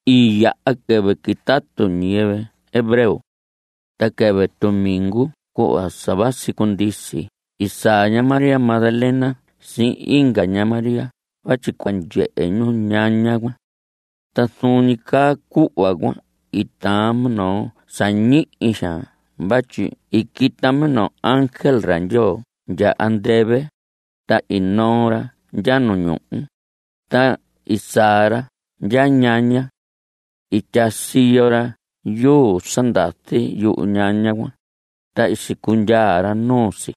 I yaha quɨvɨ quitatu ñiyɨvɨ hebreo. Ta quɨvɨ tumingu cuhva sa vasi cundisi i saa ña María Magdalena sihin inga ña Mariá vatyi cua ndyehe ñu ñaña cuan. Ta zuun ñi caa cuhva cuan i taan minoo sa ñihi xaan vatyi i quita minoo ángel ra Ndyoo ndya andɨvɨ, ta i noo ra ndya nu ñuhu, ta i saa ra ndya ñaña. I tyaa siyo ra yuu sa ndazi yuñaña cuan, ta i sicundyaa ra nuu si.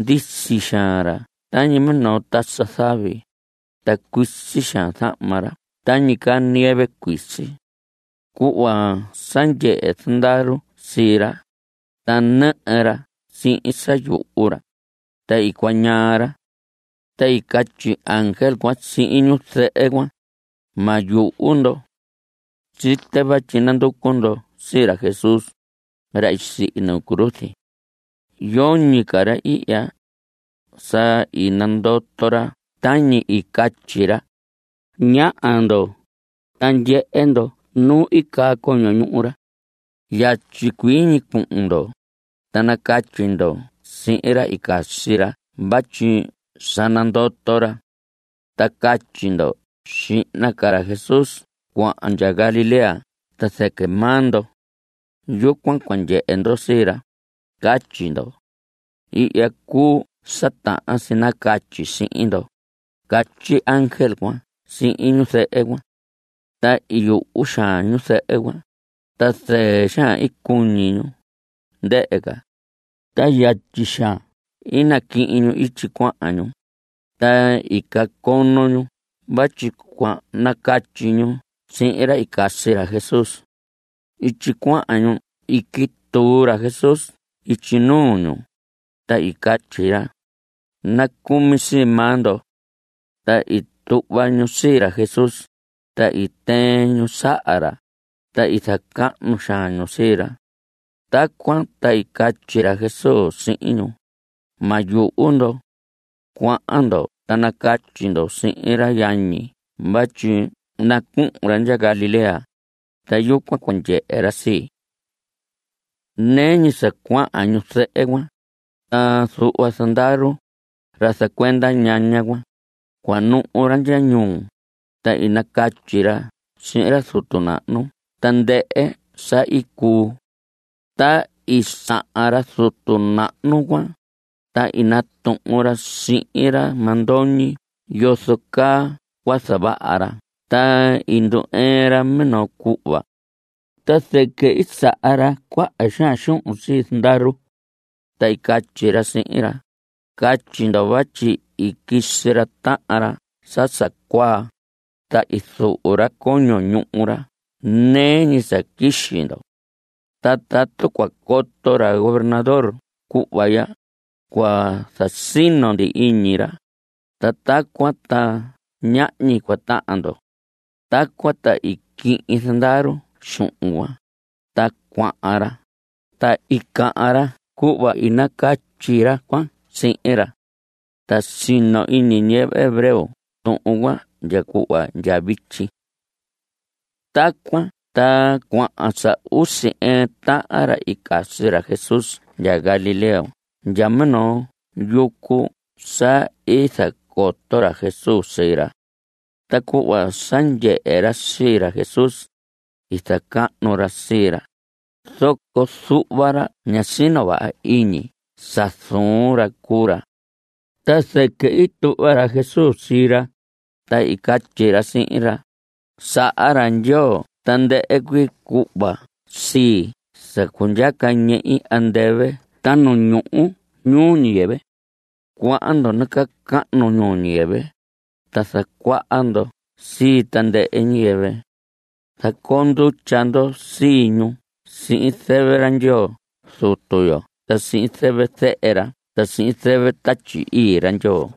Ndisi xaan ra tañi minoo tasa zavi, ta cuisi xaan zahma ra tañi caa nieve cuisi. Cuhva sa ndyehe zandaru sii ra, ta nɨhɨ ra sihin sa yuhu ra, ta i cuañaa ra. Ta i catyi ángel cuan sihin ñu zɨhɨ cuan: Ma yuhu ndo. Site vatyi nanducu ndo sii ra Jesús, ra i sihi nu cruz. Yoñi ca ra ihya. Sa i nandoto ra tañi i nacatyi ra. Ñaha ndo, ta ndyehe ndo nu i caa coño ñuhu ra. Yatyi cuii ñi cuhun ndo, ta nacatyi ndo sihin ra i casi ra vatyi sa nandoto ra. Ta catyi ndo: “Xihna ca ra Jesús cuahan ndya Galilea ta zɨquɨ maa ndo. Yucuan cua ndyehe ndo sii ra,” catyi ndo. Ihya cuu sa tahan si nacatyi sihin ndo, catyi ángel cuan sihin ñu zɨhɨ cuan. Ta i yuhu xaan ñu zɨhɨ cuan, ta zɨɨ xaan i cuñi ñu, ndɨhɨ ca, ta yatyi xaan i naquihin ñu ityi cuahan ñu, ta i cacono ñu vatyi cua nacatyi ñu sihin ra i casi ra Jesús. Ityi cuahan ñu i quituu ra Jesús ityi nuu ñu, ta i catyi ra: Nacumi sii maa ndo. Ta i tuhva ñu sii ra Jesús, ta i tɨɨn ñu saha ra, ta i zacahnu xaan ñu sii ra. Tacuan ta i catyi ra Jesús sihin ñu: Ma yuhu ndo. Cuahan ndo ta nacatyi ndo sihin ra yañi vatyi nacuhun ra ndya Galilea, ta yucuan cua ndyehe ra sii. Nɨɨ ñi sa cuahan ñu zɨhɨ cuan, ta zuhva zandaru, ra zacuenda ñaña cuan, cuanuhu ra ndya ñuu, ta i nacatyi ra sihin ra zutu nahnu tandɨhɨ sa i cuu. Ta i sahan ra zutu nahnu cuan, ta i natuhun ra sihin ra mandoñi yozo caa cua zavaha ra ta i ndu‑ɨɨn ra minoo cuhva. Ta zɨquɨ i saha ra cuaha xaan xuhun sii zandaru, ta i catyi ra sihin ra: Catyi ndo vatyi i quisi ra tahan ra sa sa cuaa, ta i zuhu ra coño ñuhu ra nɨɨ ñi sa quixi ndo. Ta tatu cua coto ra gobernador cuhva ya, cua zasino ndi iñi ra, ta tacuan ta ñahñi cua tahan ndo. Tacuan ta i quihin zandaru xuhun cuan, ta cuahan ra, ta i cahan ra cuhva i nacatyi ra cuan sihin ra. Ta sino iñi ñiyɨvɨ hebreo tuhun cuan ndya cuhva ndya vityi. Tacuan ta cuahan sa usi ɨɨn tahan ra i casi ra Jesús ndya Galilea ndya minoo yucu sa i zacoto ra Jesús sii ra. Ta cuhva sa ndyehe ra sii ra Jesús, i zacahnu ra sii ra, zoco zuhva ra ñá sino vaha iñi sa zuun ra cuu ra. Ta zɨquɨ i tuhva ra Jesús sii ra, ta i catyi ra sihin ra: Saha ra Ndyoo tandɨhɨ cuii cuhva sii sa cundyaca ñehi andɨvɨ ta nu ñuhu ñuu ñiyɨvɨ. Cuahan ndo nacahnu ñuu ñiyɨvɨ, ta zacuaha ndo sii tandɨhɨ ñiyɨvɨ. Zacoo ndutya ndo sii ñu sihin zɨvɨ ra Ndyoo Zutu yo ta sihin zɨvɨ Zehe ra ta sihin zɨvɨ Tatyi Ii ra Ndyoo.